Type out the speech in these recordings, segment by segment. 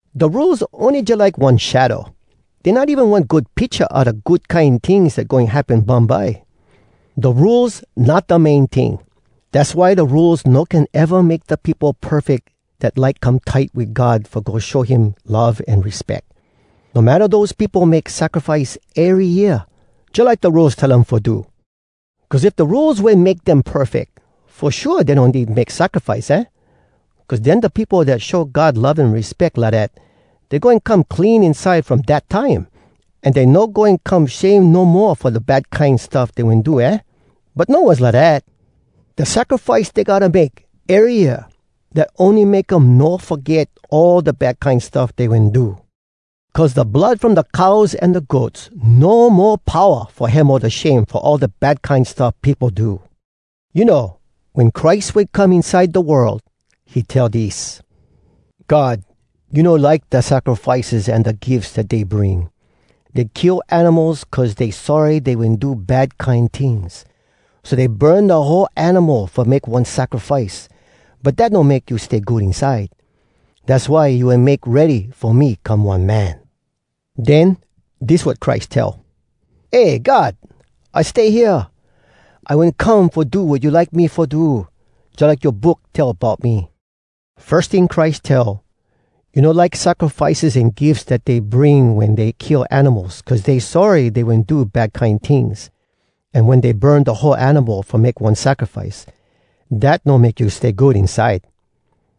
Da Rules ony jalike one shadow. Dey not even one good picha a da good kine tings dat goin happen bumbye. Da Rules not da main ting. Dass why da Rules no can eva make da peopo perfeck dat like come tight wit God fo go show him love an respeck. No matta dose peopo make sacrifice ery year, jalike da Rules tell um fo do. Cuz if da Rules wen make dem perfeck, fo shua dey no need make sacrifice, aah? Cuz den da peopo dat show God love an respeck lidat, dey goin come clean inside from dat time, an dey no goin come shame no mo fo da bad kine stuff dey wen do, aah? But no was lidat. Da sacrifice dey gotta make, ery year, dat ony make um no foget all da bad kine stuff dey wen do. Cuz da blood from da cows an da goats no mo powa fo hemo da shame fo all da bad kine stuff peopo do! You know, wen Christ wen come inside da world, he tell dis: “God, you no like da sacrifices an da gifs dat dey bring. Dey kill animals cuz dey sorry dey wen do bad kine tings, So dey burn da whole animal fo make one sacrifice, But dat no make you stay good inside. Dass why you wen make ready fo me come one man. Den, dis wat Christ tell: ‘Eh, God! I stay hea! I wen come fo do wat you like me fo do, Jalike yoa Book tell bout me.’” Firs ting Christ tell, “You no like sacrifices an gifs dat dey bring Wen dey kill animals Cuz dey sorry dey wen do bad kine tings, An wen dey burn da whole animal fo make one sacrifice, Dat no make you stay good inside.”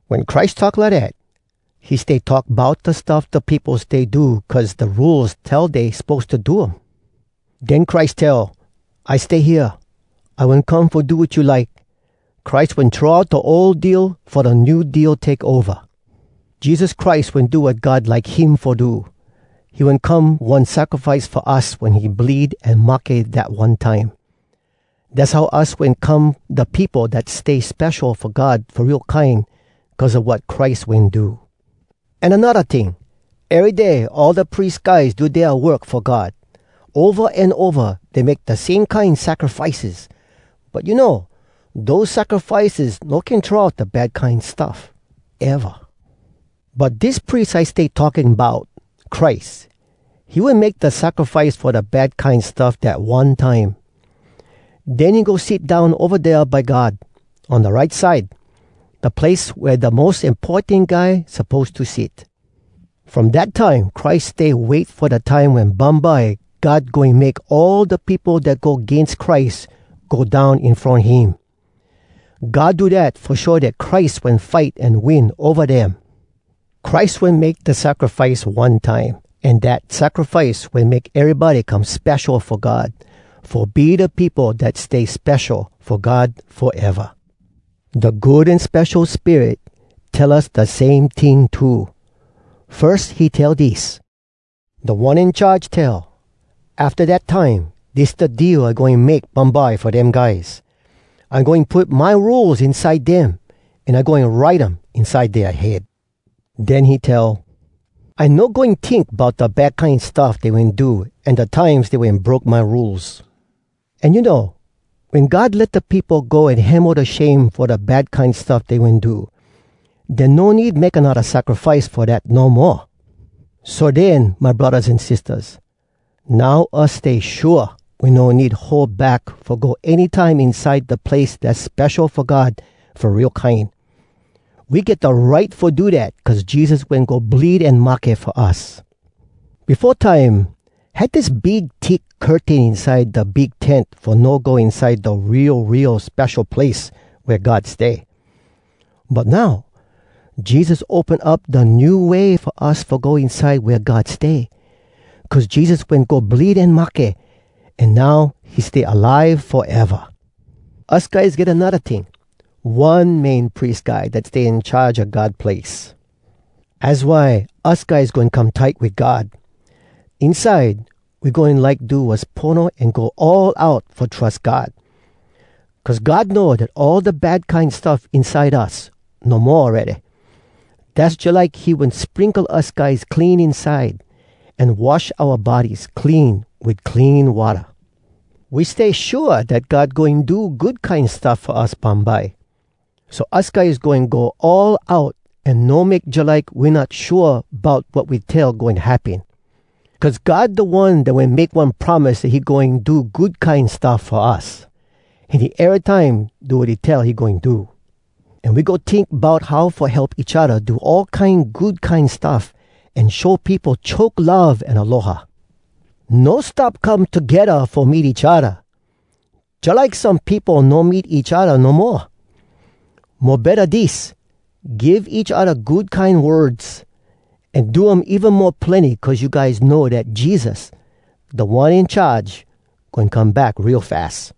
Wen Christ talk lidat, he stay talk bout da stuff da peopo stay do cuz da Rules tell dey suppose to do um. Den Christ tell, “I stay hea. I wen come fo do wat you like.” Christ wen throw out da ol deal fo da new deal take ova. Jesus Christ wen do wat God like him fo do. He wen come one sacrifice fo us wen he bleed an mahke dat one time. Dass how us wen come da peopo dat stay spesho fo God fo real kine cuz a wat Christ wen do. An anodda ting, ery day all da pries guys do dea work fo God. Ova an ova dey make da same kine sacrifices. But you know, dose sacrifices no can get throw out da bad kine stuff, eva. But dis pries I stay talking bout, Christ, he wen make da sacrifice fo da bad kine stuff dat one time. Den he go sit down ova dea by God, on da right side, da place wea da mos importan guy suppose to sit. From dat time Christ stay wait fo da time wen bumbye God goin make all da peopo dat go agains Christ go down in front him. God do dat fo show dat Christ wen fight an win ova dem. Christ wen make da sacrifice one time, an dat sacrifice wen make erybody come spesho fo God, fo be da peopo dat stay spesho fo God foeva. Da Good An Spesho Spirit tell us da same ting too. Firs he tell dis: “Da One In Charge tell, ‘Afta dat time, dis da deal I goin make bumbye fo dem guys. I goin put my Rules inside dem, An I goin write um inside dea head.’” Den he tell, “I no goin tink bout Da bad kine stuff dey wen do An da times dey wen broke my Rules.” An you know, wen God let da peopo go an hemo da shame fo da bad kine stuff dey wen do, den no need make anodda sacrifice fo dat no moa. So den, my braddahs an sistahs, now us stay shua we no need hold back fo go any time inside da place dass spesho fo God fo real kine. We get da right fo do dat cuz Jesus wen go bleed an mahke fo us. Befo time, had dis big thick curtain inside da big tent fo no go inside da Real, Real Spesho Place wea God stay. But now, Jesus open up da new way fo us fo go inside wea God stay, cuz Jesus wen go bleed an mahke, an now he stay alive foeva. Us guys get anodda ting: one Main Pries Guy dat stay in charge a God place. Az why, us guys goin come tight wit God. Inside, we goin like do wass pono an go all out fo trus God. Cuz God know dat all da bad kine stuff inside us no mo awready. Dass jalike he wen sprinkle us guys clean inside, an wash oua bodies clean wit clean watta. We stay shua dat God goin do good kine stuff fo us bumbye. So us guys goin go all out an no make jalike we not shua bout wat we tell goin happen. Cuz God da One dat wen make one promise dat he goin do good kine stuff fo us, an he erytime do wat he tell he goin do. An we go tink bout how fo help each odda do all kine good kine stuff an show peopo choke love an aloha. No stop come togedda fo meet each odda, jalike some peopo no meet each odda no moa. Mo betta dis: give each odda good kine words, an do um even mo plenny cuz you guys know dat Jesus, Da One In Charge, goin come back real fas.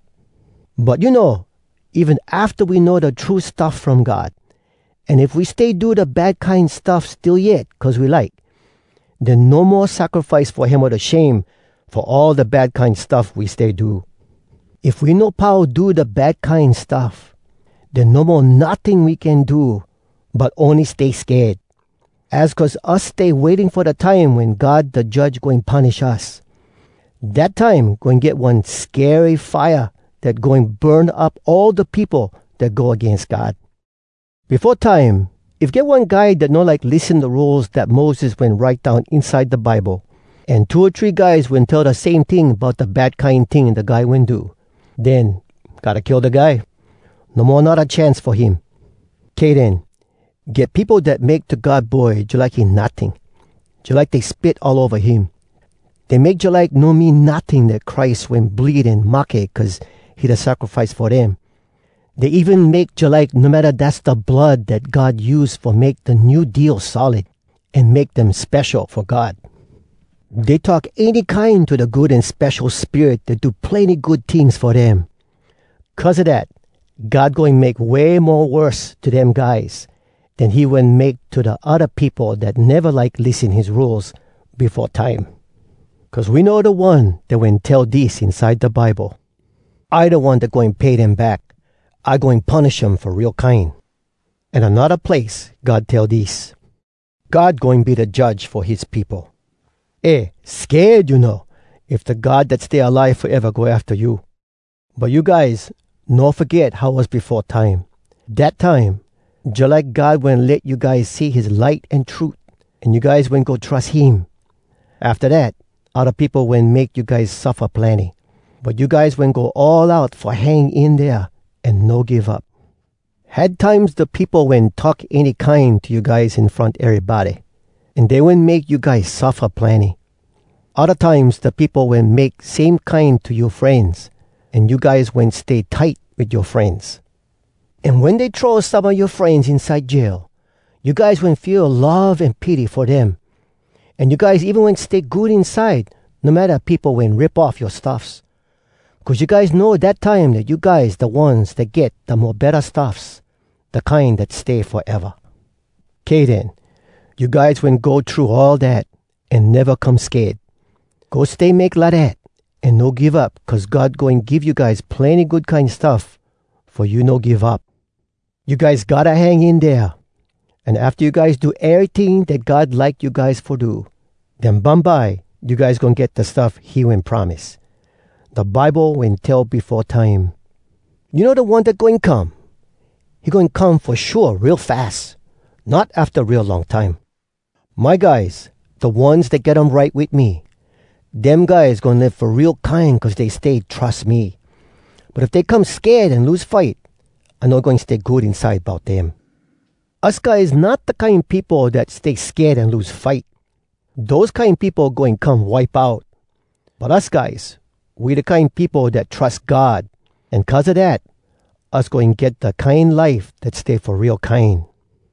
But you know, even afta we know da true stuff from God, an if we stay do da bad kine stuff still yet cuz we like, den no mo sacrifice fo hemo da shame fo all da bad kine stuff we stay do. If we no pau do da bad kine stuff, den no mo notting we can do, but ony stay sked. Az cuz us stay waiting fo da time wen God da Judge goin punish us. Dat time goin get one skery fire dat goin burn up all da peopo dat go agains God. Befo time, if get one guy dat no like lissen da Rules dat Moses wen write down inside da Bible, an two o three guys wen tell da same ting bout da bad kine ting da guy wen do, den gotta kill da guy. No mo anodda chance fo him. Kay den. Get peopo dat make to God Boy jalike he notting, jalike dey spit all ova him. Dey make jalike no mean notting dat Christ wen bleed an mahke cuz he da sacrifice fo dem. Dey even make jalike no matta dass da blood dat God use fo make da New Deal solid, an make dem spesho fo God. Dey talk any kine to da Good An Spesho Spirit dat do plenny good tings fo dem. Cuz a dat, God goin make way mo worse to dem guys den he wen make to da odda peopo dat neva like lissen his Rules befo time. Cuz we know da One dat wen tell dis inside da Bible: “I da One dat goin pay dem back. I goin punish um fo real kine.” An anodda place God tell dis: “God goin be da Judge fo his peopo.” Eh! Sked, you know, if da God dat stay alive foeva go afta you! But you guys, no foget how was befo time. Dat time, jalike God wen let you guys see his light an trut, an you guys wen go trus him. Afta dat, odda peopo wen make you guys suffa plenny, but you guys wen go all out fo hang in dea an no give up. Had times da peopo wen talk any kine to you guys in front erybody, an dey wen make you guys suffa plenny. Odda times da peopo wen make same kine to yoa frenz, an you guys wen stay tight wit yoa frenz. An wen dey wen throw some a yoa frenz inside jail, you guys wen feel love an pity fo dem. An you guys even wen stay good inside no matta peopo wen rip off yoa stuffs. Cuz you guys know dat time dat you guys da ones dat get da mo betta stuffs, da kine dat stay foeva. Kay den. You guys wen go thru all dat, an neva come sked. Go stay make lidat, an no give up cuz God goin give you guys plenny good kine stuff fo you no give up! You guys gotta hang in dea. An afta you guys do eryting dat God like you guys fo do, den bumbye you guys goin get da stuff he wen promise. Da Bible wen tell befo time, “You know da One dat goin come? He goin come fo shua real fas, Not afta real long time. My guys, da ones dat get um right wit me, Dem guys goin live fo real kine cuz dey stay trus me. But if dey come sked an lose fight, I no goin stay good inside bout dem.” Us guys not da kine peopo dat stay sked an lose fight. Dose kine peopo goin come wipe out. But us guys, we da kine peopo dat trus God, an cuz a dat, us goin get da kine life dat stay fo real kine.